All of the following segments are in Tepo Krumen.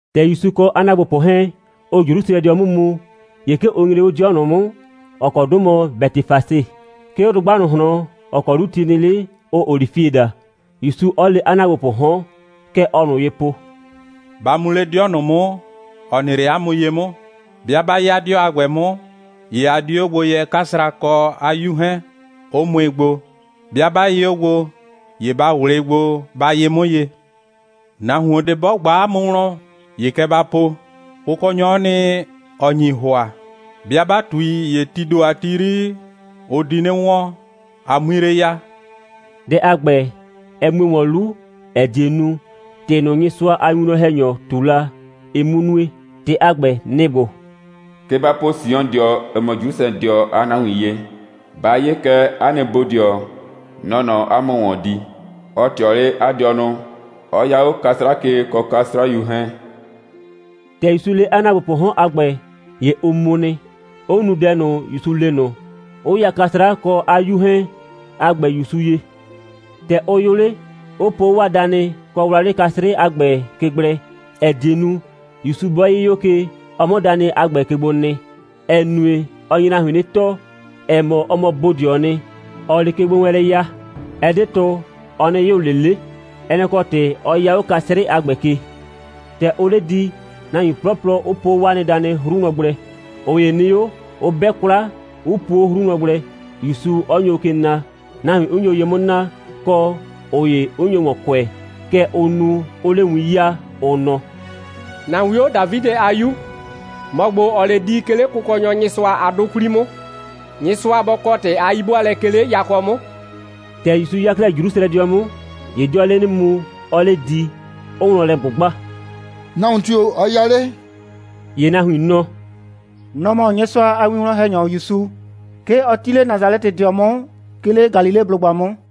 ‑Tɛ ‑Yusu kɔ 'a ‑naagbopʋ 'hɛɛn, ʋʋ Jrusrɛdɩɔ 'mʋ mu, ‑ye 'ke ʋ nyre 'le 'dɩɔ ꞊nʋ 'mʋ, ‑ɔ kɔ 'dʋ mɔ Bɛtɩfase, 'ke 'o dʋgba ꞊nʋ ꞊hlɔn, ‑ɔ kɔ 'lu ti nɩ 'le, ʋʋ olifie daa, ‑Yusu 'ɔ le 'a ‑naagbopʋʋ 'hɔn. Kɛ ɔɔ ꞊nʋ ye po: «Ba mu 'le 'dɩɔ ꞊nʋ 'mʋ, ‑ɔ nɩ 'le 'a mʋ ye 'mʋ. 'Bɩa 'ba 'ya 'dɩɔ a ‑gbɛ 'mʋ, ‑ye a di 'o gbo yɛ 'kasra kɔ 'a 'yu 'hɛɛn, 'ʋ mʋɩ gbo. 'Bɩa 'ba yɩ 'o gbo, ‑ye ba ꞊wlɩɩ gbo, ba yɩ 'mʋ ye. Nahuon ꞊de 'bɔ ꞊gba 'a mʋ wlɔn, ‑ye kɛ ba po: Kʋkɔnyɔ'ɔ nɩ, ‑ɔ nyi ‑hʋa. 'Bɩa 'ba ꞊tui, ‑ye tii ‑do a ti 'yri, ʋ di 'nɩ wɔn, a 'mui 'le ya.» Dɛ a ‑gbɛ, ɛ mue ‑wɔn 'lu, ‑ɛ die nu, ‑tɩ ꞊nʋ, Nyɩsʋa a winwlɔn‑hɛnyɔ ꞊tu la, ɩ 'mʋ nue. ‑Tɩ a ‑gbɛ, nɩ‑ ‑gbo: «Kɛ ba po Siondɩɔ (‑ɔ mɔ Jrusrɛdɩɔ) a nahuin ye: Ba 'ye kɛ, 'a nɩ bodɩɔ, nɔ‑ɔ nɔ 'a mʋ ‑wɔn di. Ɔ ꞊tɩɔ 'le 'a dɩɔnʋ, 'ɔ 'ya 'o 'kasra ke, kɔ 'kasrayu 'hɛɛn.» ‑Tɛ ‑Yusu le 'a ‑naagbopʋʋ 'hɔn a ‑gbɛ, ‑ye ʋ mu nɩ, 'ʋ nu dɛ ꞊nʋ, ‑Yusu le ꞊nʋ, 'ʋ ya 'kasra kɔ 'a 'yu 'hɛɛn a ‑gbɛ ‑Yusu ye. ‑Tɛ ʋ yʋ 'le, 'ʋ po 'o 'waa danɩ kɔ wlawlɩ 'kasrɩ a ‑gbɛ ke gblɛ, ‑ɛ die nu, ‑Yusu 'bɔ 'yɩ 'o ke, ɔ 'mʋ danɩ a ‑gbɛ ke gbo nɩ. (‑Ɛ nue, ɔ nye nahuin 'nɩ tɔɔ, ‑ɛ mɔ, ɔ mɔ bodɩɔɔ nɩ, ‑ɔɔ 'le kegbowɛɛnlɛ ya, ɛ 'de tʋ, ɔ 'nɩ yʋ ꞊le 'le. Ɛ nɛ‑ kɔ ‑tɩ 'ɔ 'ya 'o 'kasrɩ a ‑gbɛ ke.) ‑Tɛ ʋʋ 'le di, nahuin 'plɔplɔ 'ʋ po 'o 'waa nɩ danɩ 'hru wlɔn gblɛ. ꞊Ʋ ‑ye nɩ 'o, 'ʋ 'bɛ 'kwla, 'ʋ puo 'o 'hru wlɔn gblɛ, ‑Yusu 'ɔ nyo ke na, nahuin 'ʋ nyo ye 'mʋ naa, kɔ, ꞊ʋ ‑ye 'ʋ nyo ‑wɔn kʋɛ. Kɛ ʋʋ nu, 'ʋʋ 'le win 'yaa, ʋ nɔ: «‑Na 'wio, Dafidɩ a 'Yu, ‑mɔ ‑gbo, ‑ɔɔ 'le di, 'ke 'le Kʋkɔnyɔ Nyɩsʋa a 'dʋ 'kwli 'mʋ, Nyɩsʋa bɔ kɔ ‑tɩ a 'yi'bʋaalɛ, 'ke 'le yakɔ 'mʋ!» ‑Tɛ ‑Yusu 'ya 'klɛɛ Jrusrɛdɩɔ 'mʋ, ‑ye 'dɩɔɔ 'le 'nɩ mu, 'ɔɔ 'le di, 'ʋʋ wlɔn lɛ ꞊gbʋgba: «Nahuon tio‑ ɔ 'ya 'le?» ‑Ye nahuin nɔ: «Nɔ‑ mɔ Nyɩsʋa a winwlɔn‑hɛnyɔ ‑Yusu. 'Ke ɔ 'ti 'le Nasalɛtɩdɩɔ 'mʋ, 'ke 'le Galileblʋgba 'mʋ.»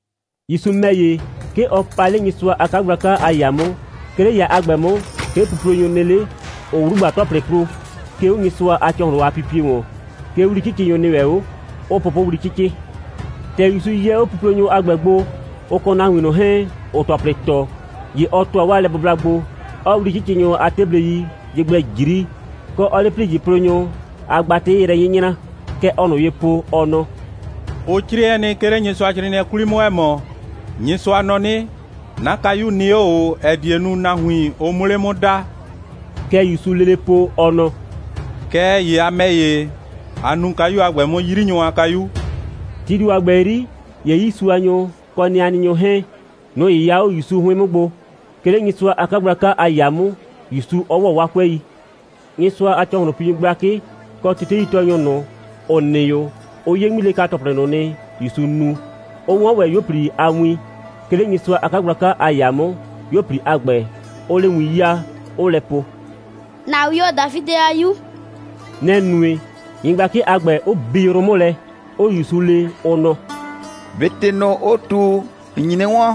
‑Yusu ‑mɛ ‑ye, 'ke ɔ pa 'le Nyɩsʋa a 'kagblaka a ‑yaa 'mʋ. 'Ke 'le ‑yaa a ‑gbɛ 'mʋ, 'ke puplonyʋ nɩ 'le, 'ʋʋ 'wlugba‑tɔplɩ plo, 'ke 'o Nyɩsʋa a ‑cɔhlʋn a pipie ‑wɔn. 'Ke 'wli'cɩcɩnyʋ nɩ ‑wɛ 'o, 'ʋʋ pʋpʋwli 'cɩcɩ. ‑Tɛ ‑Yusu yɛ 'o puplonyʋ a ‑gbɛ gbo, ʋ kɔ nahuin ꞊nʋ 'hɛɛn, ‑ʋʋ ‑tɔplɩ ‑tɔ, ‑ye ɔ ‑tʋa 'waa lɛbʋbla gbo, 'ɔɔ 'wli'cɩcɩnyʋ a 'teblei ye gblɛ ꞊jri, kɔ, 'ɔɔ 'le ‑plijɩplonyʋ a gbatɩ yrɛ 'nyɩnyra. Kɛ ɔɔ ꞊nʋ ye po, ɔ nɔ: «Ʋ 'crɩɛ nɩ, 'ke 'le Nyɩsʋacrɩɩnɩɛ 'kwli 'mʋ, ‑ɛ mɔ: Nyɩsʋa nɔ 'nɩ: 'Na kayu nɩ 'o ꞊o, ‑ɛ die nu, nahuin, ʋ 'mʋ 'le 'mʋ daa.» Kɛ ‑Yusuu lele po, ɔ nɔ: «Kɛɛ ‑ye a ‑mɛ ‑ye, a nuu kayu a ‑gbɛ 'mʋ 'yrinyʋ a kayu.» Tii ‑do a ‑gbɛ 'yri, ‑ye 'yiisuanyʋ, kɔ nɩanɩnyʋ 'hɛɛn, nʋ‑ 'yɩya 'o ‑Yusu 'hʋɩn 'mʋ gbo, 'ke 'le Nyɩsʋa a 'kagblaka a ‑yaa 'mʋ, ‑Yusu 'ɔ ‑wɔ 'waa 'kʋɛi. Nyɩsʋa a ‑cɔhlʋnpinyʋ gblakɩ kɔ teteitɔɔnyʋ ꞊nʋ, ‑ʋ nɩ 'o, ʋ 'ye 'ŋmilɛka‑tɔplɩ ꞊nʋ nɩ, ‑Yusu nu, 'ʋ 'wɔn ‑wɛ 'yuo꞊pli a win, 'ke 'le Nyɩsʋa a 'kagblaka a ‑yaa 'mʋ, 'yuo꞊pli a ‑gbɛ, 'ʋʋ 'le win 'yaa, 'ʋʋ lɛ po: «‑Na 'wio, Dafidɩ a 'Yu!» Nɛ‑ nue, nyɩgblakɩ a ‑gbɛ, 'ʋ bi yrʋ 'mʋ lɛ, 'ʋʋ ‑Yusu le, ʋ nɔ: «꞊Be ‑tɩ ꞊nʋ, ʋʋ ꞊tu, ‑n nyi 'nɩ 'wɔn?»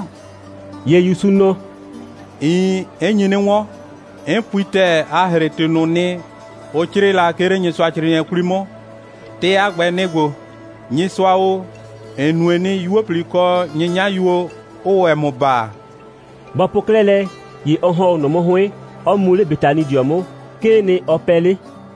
‑Ye ‑Yusu nɔ: «Iin, 'n nyi 'nɩ 'wɔn. 'N pui ‑tɛɛ, a ‑hre ‑tɩ ꞊nʋ nɩ, ʋ 'crɩɩ la, 'ke 'le Nyɩsʋacrɩɩnɩɛ 'kwli 'mʋ. ‑Tɩ a ‑gbɛ, nɩ‑ ‑gbo: Nyɩsʋa o, ‑n nue nɩ, 'yuo꞊pli, kɔ 'nyɩnyayuo, 'ʋʋ ‑wɛ ‑mʋ baa.» Bɔ po 'klɛɛ lɛ, ‑ye ɔ ‑hɔn 'o ꞊nʋ 'mʋ 'hʋɩn, 'ɔ mu 'le Betanidɩɔ 'mʋ. 'Kee nɩ, ɔ pɛɛ 'le.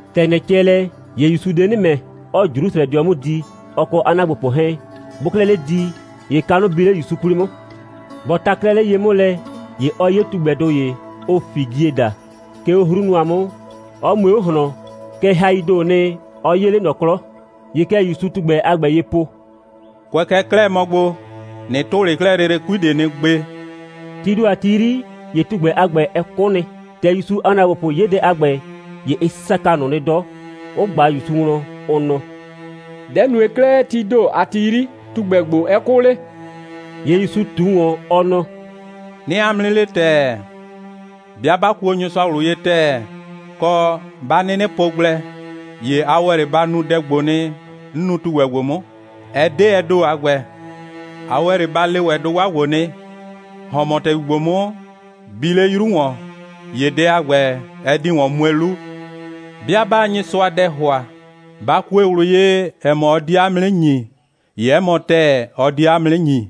‑Tɛ ‑nyrɛ cɛ lɛ, ‑ye ‑Yusuu de 'nɩ ‑mɛ, 'ɔɔ Jrusrɛdɩɔ 'mʋ di, ɔ kɔ 'a ‑naagbopʋ 'hɛɛn. Bʋʋ 'klɛɛ 'le di, ‑ye kanʋ bi 'le ‑Yusu 'kwli 'mʋ. Bɔ ta 'klɛɛ 'le ye 'mʋ lɛ, ‑ye ɔ 'ye tugbɛdʋ ‑ye, ʋʋ figie daa, 'ke 'o 'hru nʋa 'mʋ, 'ɔ mue 'o ꞊hlɔn, kɛɛ, haii ‑doo nɩ, ɔ 'yee 'le ꞊nɔ 'klɔ. ‑Ye kɛ ‑Yusuu tugbɛ a ‑gbɛ ye po: «Kʋɛ kɛ 'klɛɛ mɔ gbo, ꞊nɩ tʋ 'le 'klɛɛ lele 'kui ꞊de nɩ gbe!» Tii ‑do a ti 'yri, ‑ye tugbɛ a ‑gbɛ, ɛ 'kʋ nɩ. ‑Tɛ ‑Yusu a ‑naagbopʋ 'ye dɛ a ‑gbɛ, ‑ye ɩ saka ꞊nʋ nɩ 'dɔ, 'ʋ ꞊gba ‑Yusu wlɔn, ʋ nɔ: «Dɛ‑ nue 'klɛɛ, tii ‑do a ti 'yri, tugbɛ ‑gbo, 'ɛ 'kʋ 'le?» ‑Ye ‑Yusu ꞊tu ‑wɔn, ɔ nɔ: «'Nɩɩ 'a mʋ 'nɩ le ‑tɛɛ: 'Bɩa 'ba kuo Nyɩsʋa ꞊wlʋ ye ‑tɛɛ, kɔ, 'ba 'nɩnɩ po gblɛ, ‑ye a ‑wɛ 'le ba nu dɛ ‑gbo nɩ, 'n nu tugbɛ ‑gbo 'mʋ. Ɛ 'de ɛ ‑do a ‑gbɛ. A ‑wɛ 'le ba le ‑wɛ dʋgba ‑gbo nɩ: ‑Hɔn mɔ ‑tɛgbi ‑gbo 'mʋ, bi 'le 'yru ‑wɔn! ‑ye dɛ a ‑gbɛ, ɛ di ‑wɔn mue 'lu. 'Bɩa 'baa Nyɩsʋa dɛ ‑hʋa, 'ba kue ꞊wlʋ ye, ‑ɛ mɔ, ɔ die 'a mʋ 'nɩ ‑nyi, ‑ye 'ɛ mɔ ‑tɛɛ, ɔ die 'a mʋ 'nɩ ‑nyi.»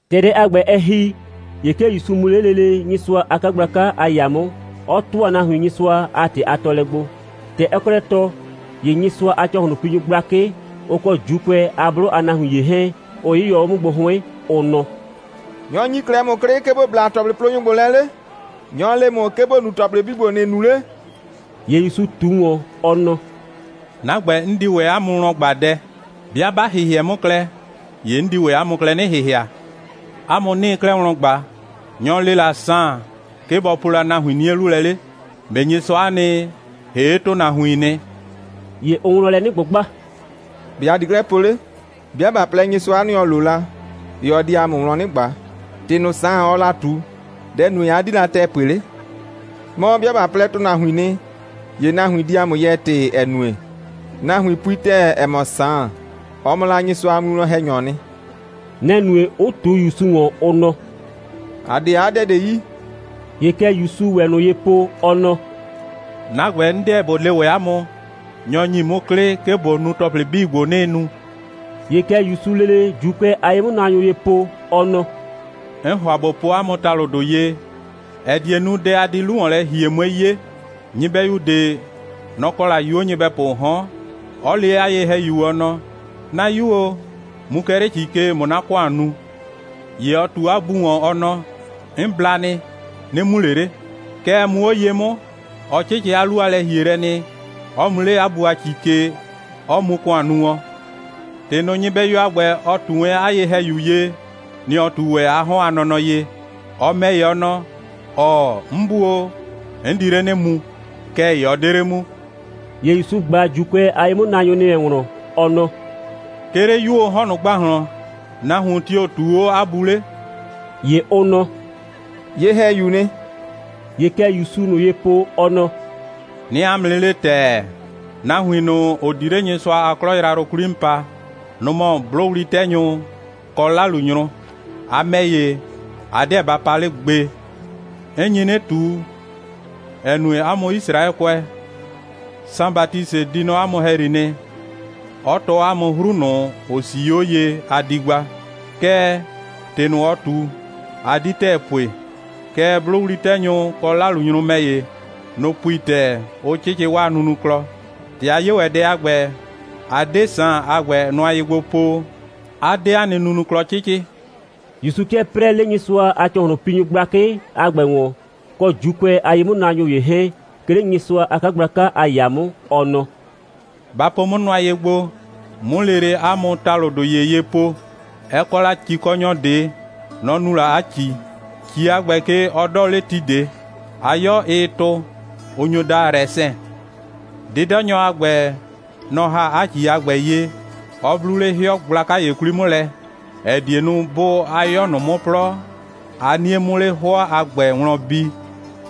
‑Tɛ dɛ a ‑gbɛ, ɛ ‑hi, ‑ye 'ke ‑Yusu mu 'le lele Nyɩsʋa a 'kagblaka a ‑yaa 'mʋ, 'ɔ ‑tʋa nahuin Nyɩsʋa a ‑tɩ a tɔɔlɛ gbo. ‑Tɛ ɔɔ 'klɛɛ tɔɔ, ‑ye Nyɩsʋa a ‑cɔhlʋnpinyʋ gblakɩ, ʋ kɔ ‑Juukʋɛ a 'blʋ a nahuin ‑ye 'hɛɛn, ʋ 'yɩyɔ 'o 'mʋ gbo 'hʋɩn, ʋ nɔ: «Nyɔ‑ ‑nyi 'klɛɛ ‑mʋ 'klɩ, 'ke ‑bo bla ‑tɔplɩplonyʋ ‑gbo lɛ 'le? Nyɔ‑ le ‑mʋ, 'ke ‑bo nu ‑tɔplɩ 'bii ‑gbo, ‑nɩɩ nu 'le?» ‑Ye ‑Yusu ꞊tu ‑wɔn, ɔ nɔ: «'Na ‑gbɛ, 'n di ‑wɛ 'a mʋ wlɔn ꞊gba dɛ. 'Bɩa 'ba ‑hɩhɩɛ 'mʋ klɛ, ‑ye 'n di ‑wɛ 'a mʋ klɛ 'nɩ ‑hɩhɩa. 'A mʋ 'nɩɩ 'klɛɛ wlɔn ꞊gba: Nyɔ‑ le la Saan, 'ke bɔ po la nahuin 'nie 'lu lɛ 'le? ꞊Be Nyɩsʋa'a nɩ, ‑hee' ‑tʋnahuiin nɩ?» ‑Ye ʋʋ wlɔn lɛ 'nɩ ꞊gbʋgba: «‑Be' ‑a di 'klɛɛ po 'le? 'Bɩa ꞊ba plɛ: Nyɩsʋa'a nɩ, ‑ɔ lo la, ‑ye ɔ di ‑a mʋ wlɔn 'nɩ ꞊gba: ‑Tɩ ꞊nʋ, Saan, ɔɔ la ꞊tu, dɛ‑ nue, 'a 'di la ‑tɛɛ pue 'le? Mɔ, 'bɩa ꞊ba plɛ, ‑tʋnahuiin nɩ, ‑ye nahuin di ‑a mʋ yɛɛ ‑tɩ, ‑ɛ nue, nahuin pui ‑tɛɛ, ‑ɛ mɔ, Saan, ɔ mɔ la Nyɩsʋa a winwlɔn‑hɛnyɔɔ nɩ.» Nɛ‑ nue, 'ʋ ꞊tu ‑Yusu ‑wɔn, ʋ nɔ: «‑A 'de 'a dɛ ꞊de yi.» ‑Ye kɛ ‑Yusuu ‑wɛ ꞊nʋ ye po, ɔ nɔ: «'Na ‑gbɛ, 'n 'deɛ ꞊bo le ‑wɛ 'a mʋ, nyɔ‑ ‑nyi 'mʋ 'klɩ, 'ke ꞊bo nu ‑tɔplɩ 'bii ‑gbo, 'nɩɩ nu.» ‑Ye kɛ ‑Yusuu lele ‑Juukʋɛ a ye'mʋnaanyʋ ye po, ɔ nɔ: «'N ‑hʋa ꞊bo po 'a mʋ ‑talʋdʋ ye, ‑ɛ die nu, dɛ a di 'lu ‑wɔn lɛ ‑hie, 'mue 'ye. Nyɩbɛyu ꞊de, nɔ‑ kɔ la 'yuo nyɩbɛpʋʋ 'hɔn, 'ɔ le 'a ye‑hɛyu, ɔ nɔ: 'Na 'yu o, mu kɛ 'le ‑ci ke, ꞊mʋ 'na ‑kʋan nu. ‑Ye ɔ ꞊tu 'a bu ‑wɔn, ɔ nɔ: 'N bla nɩ. 'Nɩ mu ꞊le 'le. Kɛɛ, muu 'o ye 'mʋ, ɔ 'cɩcɩ 'a 'lu a lɛ‑hielɛ nɩ, 'ɔ mu 'le 'a bu a ‑ci ke, 'ɔ mu ‑kʋan nu wɔn. ‑Tɩ ꞊nʋ, nyɩbɛyu a ‑gbɛ, ɔ ꞊tu wɛn 'a ye‑hɛyu ye, nɩ‑ ɔ ꞊tu ‑wɛ 'a 'hɔn a nɔnɔ ye. Ɔ ‑mɛ ‑ye, ɔ nɔ: ‑Ɔɔ, 'n bu o, 'n di 'le 'nɩ mu. Kɛɛ ‑ye ɔ 'de 'le mu.» ‑Ye ‑Yusu ꞊gba ‑Juukʋɛ a ye'mʋnaanyʋ ‑nɩ wɛn wlɔn, ɔ nɔ: «'Ke 'le 'yuoo 'hɔn ꞊nʋ ‑gbahlɔn, nahuon tio‑ ꞊tuu 'o 'a bu 'le?» ‑Ye ʋ nɔ: «Ye‑hɛyuu nɩ.» ‑Ye kɛ ‑Yusuu ꞊nʋ ye po, ɔ nɔ: «'Nɩɩ 'a mʋ 'nɩ le ‑tɛɛ, nahuin ꞊nʋ, ‑ʋ di 'le Nyɩsʋa a 'klɔ yrayrʋ 'kwli 'mʋ pa, nʋ‑ mɔ 'blʋwli'tɛnyʋ, kɔ 'lalunyrʋ. A ‑mɛ ‑ye, a 'deɛ ba pa 'le gbe. 'N nyi 'nɩ ꞊tu, ‑ɛ nue, 'a mʋ Yisraɛkʋɛ, Saan Batisɩ di nɔ 'a mʋ ‑hɛyri nɩ, 'ɔ tɔɔ 'a mʋ 'hru ꞊nʋ, ‑ʋ 'sii 'o ye, a di gba. Kɛɛ, ‑tɩ ꞊nʋ, ɔ ꞊tu, a 'di ‑tɛɛ pue. Kɛɛ, 'blʋwli'tɛnyʋ, kɔ 'lalunyrʋ ‑mɛ ‑ye, nʋ‑ pui ‑tɛɛ, 'ʋ 'cɩcɩ 'waa nunuklɔ. ‑Tɛ a 'ye ‑wɛ dɛ a ‑gbɛ, a 'de Saan a ‑gbɛ nʋa ye gbo po, 'a 'de 'a nɩ nunuklɔ 'cɩcɩ.» (‑Yusu 'kɩɛ 'prɛɛ 'le Nyɩsʋa a ‑cɔhlʋnpinyʋ gblakɩ a ‑gbɛ ‑wɔn, kɔ ‑Juukʋɛ a ye'mʋnaanyʋ ‑ye 'hɛɛn, 'ke 'le Nyɩsʋa a 'kagblaka a ‑yaa 'mʋ.) Ɔ nɔ: «Ba po 'mʋ nʋa ye gbo, 'mʋ lele 'a mʋ ‑talʋdʋ ‑ye ye po: Ɛ kɔ la ‑cikɔnyɔ ꞊de. Nɔ‑ nu la 'a ‑ci. ‑Ci a ‑gbɛ ke, ɔ 'dɔɔ 'le ti ꞊de. 'A 'yɔ, ɩɩ tʋ, ʋ nyo daa rɛsɛn. 'Dɩdɔnyɔ a ‑gbɛ, nɔ‑ ‑ha 'a ‑ci a ‑gbɛ ye, 'ɔ 'blu 'le 'hɩɔ gblaka ‑ye 'kwli 'mʋ lɛ, ‑ɛ die nu, 'bʋʋ 'a 'yɔ ꞊nʋ 'mʋ 'plɔ, 'a 'nie 'mʋ 'le 'hʋɔ a ‑gbɛ wlɔn bi,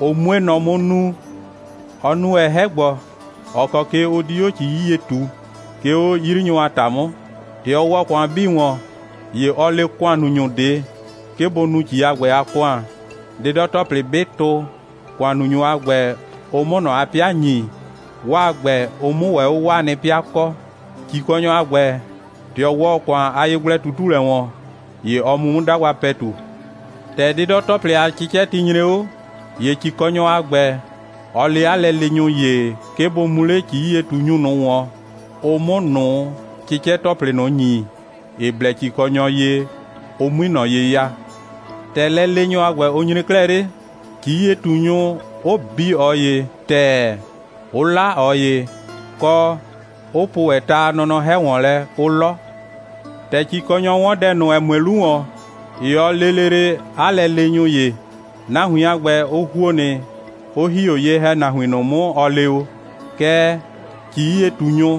ʋ 'mue nɔ 'mʋ nuu. Ɔ nu ‑wɛ 'hɛ‑gbɔ, ‑ɔ kɔ ke ʋ di 'o ‑ci 'yie ꞊tuu, 'ke 'o 'yrinyʋ a ‑ta 'mʋ. ‑Tɛ ɔ ‑wɔ ‑kʋan 'bii ‑wɔn, ‑ye ɔ le ‑kʋannunyʋ ꞊de, 'ke bʋ nu ‑ci a ‑gbɛ a ‑kʋan, 'dɩdɔ‑tɔplɩ 'bɩ tʋ, ‑kʋannunyʋ a ‑gbɛ, ʋ 'mʋ ꞊nɔ 'a 'pɩa ‑nyi, 'waa ‑gbɛ, ʋ 'mʋ ‑wɛ 'o 'waa nɩ 'pɩa kɔ. ‑Cikɔnyɔ a ‑gbɛ, ‑tɛ ɔ ‑wɔ ‑kʋan a yegblɛ꞊tutulɛ ‑wɔn, ‑ye ɔ mu 'mʋ 'dagba ‑pɛtu. ‑Tɛ 'dɩdɔ‑tɔplɩ a 'cɩcɛti nyre 'o, ‑ye ‑cikɔnyɔ a ‑gbɛ, ɔ le 'a lɛleenyʋ ‑ye, 'ke bʋ mu 'le ‑ci'yie꞊tunyʋ ꞊nʋ ‑wɔn, ʋ 'mʋ ꞊nʋ 'cɩcɛ‑tɔplɩ ꞊nʋ ‑nyi, ‑ɩ blɛ ‑cikɔnyɔ ye, ʋ 'mui ꞊nɔ ye ya. ‑Tɛ lɛleenyʋ a ‑gbɛ, ʋ nyre 'klɛɛ 'le, ‑ci'yie꞊tunyʋ, 'ʋ bi ꞊ɔ ‑ye ‑tɛɛ, 'ʋ 'la ꞊ɔ ‑ye, kɔ, 'ʋ po ‑wɛ ta a nɔnɔ 'hɛ ‑wɔn lɛ, 'ʋ 'lɔ. ‑Tɛ ‑cikɔnyɔ 'wɔn dɛ ꞊nʋ, ‑ɛ mue 'lu ‑wɔn, ‑ye ɔ lee lele 'a lɛleenyʋ ‑ye. Nahuin a ‑gbɛ, ʋ ‑huo nɩ, 'ʋ ‑hi 'o ye‑hɛnahuin ꞊nʋ 'mʋ, ɔ le o. Kɛɛ, ‑ci'yie꞊tunyʋ,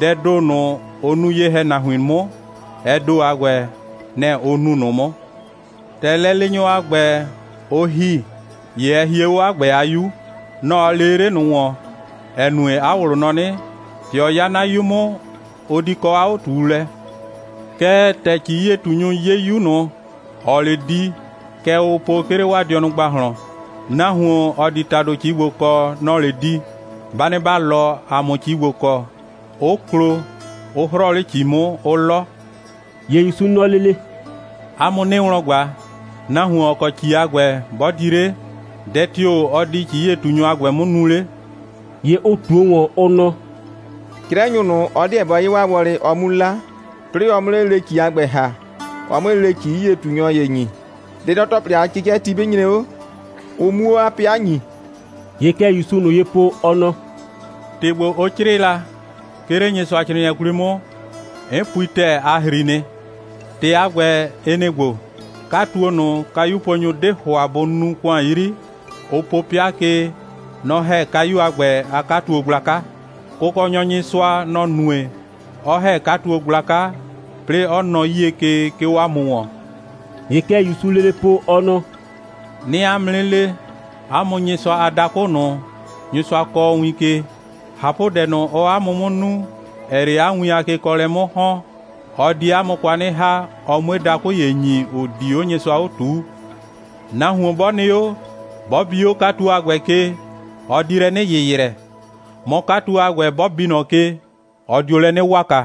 dɛɛ ‑do ꞊nʋ, ʋ nu ye‑hɛnahuin 'mʋ, ɛ ‑do a ‑gbɛ, nɛ‑ ʋ nu ꞊nʋ 'mʋ. ‑Tɛ lɛleenyʋ a ‑gbɛ, ʋ ‑hi, ‑ye ɛ hie 'o 'a ‑gbɛ a 'yu. Nɔ‑ ɔ lee 'le ꞊nʋ ‑wɔn, ‑ɛ nue, 'a ꞊wlʋ nɔ 'nɩ: ‑Tɛ ɔ 'ya 'na 'yu 'mʋ, ʋ di kɔ 'a 'o꞊tuulɛ. Kɛɛ, ‑tɛ ‑ci'yie꞊tunyʋ 'ye 'yu ꞊nʋ, ‑ɔɔ 'le di, kɛ ʋʋ po, 'ke 'le 'waa dɩɔnʋ ‑gbahlɔn: Nahuon, ‑ɔ di ‑tado ‑ci ‑gbo kɔ, nɔ‑ɔ 'le di. Ba nɩ ‑ba 'lɔ, ‑a 'mʋ ‑ci ‑gbo kɔ, 'ʋ klo, 'ʋ 'hrɔɔ 'le ‑ci 'mʋ, 'ʋ 'lɔ.» ‑Ye ‑Yusu nɔ lele: «'A mʋ 'nɩɩ wlɔn ꞊gba, nahuon, ‑ɔ kɔ ‑ci a ‑gbɛ, 'bɔ di 'le, dɛ tio‑ ɔ di ‑ci'yie꞊tunyʋ a ‑gbɛ 'mʋ nu 'le?» ‑Ye ʋ ꞊tuo ‑wɔn, ʋ nɔ: «'Crɛnyʋ ꞊nʋ, ɔ 'deɛ bɔ 'ye 'waa wɔlɩ, ɔ 'mu 'la, 'plɩɩ ɔ 'mʋ 'le lele ‑ci a ‑gbɛ ‑ha, ɔ 'mue lele ‑ci'yie꞊tunyʋ ‑ye ‑nyi, 'dɩdɔ‑tɔplɩ a 'cɩcɛti 'bɩ nyre 'o, ʋ 'muo 'a 'pɩa ‑nyi.» ‑Ye kɛ ‑Yusuu ꞊nʋ ye po, ɔ nɔ: «‑Tɩ ‑gbo, ʋ 'crɩɩ la, 'ke 'le Nyɩsʋacrɩɩnɩɛ 'kwli 'mʋ, 'n pui ‑tɛɛ, a ‑hri nɩ. ‑Tɩ a ‑gbɛ, ɩ nɩ‑ ‑gbo: 'Katuo ꞊nʋ, kayuponyʋ 'de ‑hʋa bʋ nuu ‑kʋan 'yri, ʋ po 'pɩa ke, nɔ‑ ‑hɛ kayu a ‑gbɛ a 'katuo gblaka. Kʋkɔnyɔ Nyɩsʋa, nɔ‑ nue, 'ɔ ‑hɛ 'katuo gblaka, 'plɩɩ 'ɔ nɔ 'yie ke, 'ke 'o ‑a mʋ ‑wɔn.» ‑Ye kɛ ‑Yusuu lele po, ɔ nɔ: «'Nɩɩ 'a mʋ 'nɩ le, 'a mʋ Nyɩsʋa a dakʋ ꞊nʋ, Nyɩsʋa kɔɔ win ke, ꞊hapʋdɛ ꞊nʋ, ɔɔ 'a mʋ 'mʋ nu, ‑ɛɛ 'le 'a nɩ win a kekɔɔlɛ 'mʋ ‑hɔn, ɔ die 'a mʋ kwa 'nɩ ‑ha, ɔ 'mue dakʋ ‑ye ꞊nʋ ‑nyi, ‑ʋ di 'o Nyɩsʋa 'o ꞊tuu. [ Nahuon 'bɔ nɩ 'o, 'bɔ bi 'o 'katuo a ‑gbɛ ke, ɔ di lɛ 'nɩ ‑yɩyrɛ, mɔ, 'katuo a ‑gbɛ, 'bɔ bi ꞊nɔ ke, ɔ dio lɛ 'nɩ waka.]»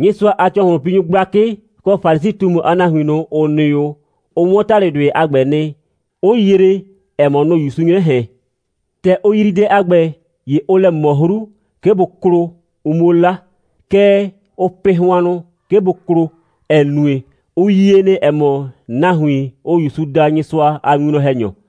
Nyɩsʋa a ‑cɔhlʋnpinyʋ gblakɩ kɔ Falisi꞊tumu a nahuin ꞊nʋ, ‑ʋ nɩ 'o, ʋ 'wɔn ‑talʋdʋɩ a ‑gbɛ nɩ, 'ʋ yree, ‑ɛ mɔ, nʋ‑ ‑Yusuu 'nyrɛ ꞊hɛn. ‑Tɛ ʋ yrii dɛ a ‑gbɛ, ‑ye ʋʋ lɛ ꞊mɔ 'hru, 'ke bʋ klo, ʋ 'muo 'la. Kɛɛ, ʋʋ pɩ hʋannʋ, 'ke bʋ klo, ‑ɛ nue, ʋ yie nɩ, ‑ɛ mɔ, nahuin, ʋʋ ‑Yusu daa Nyɩsʋa a winwlɔn‑hɛnyɔ.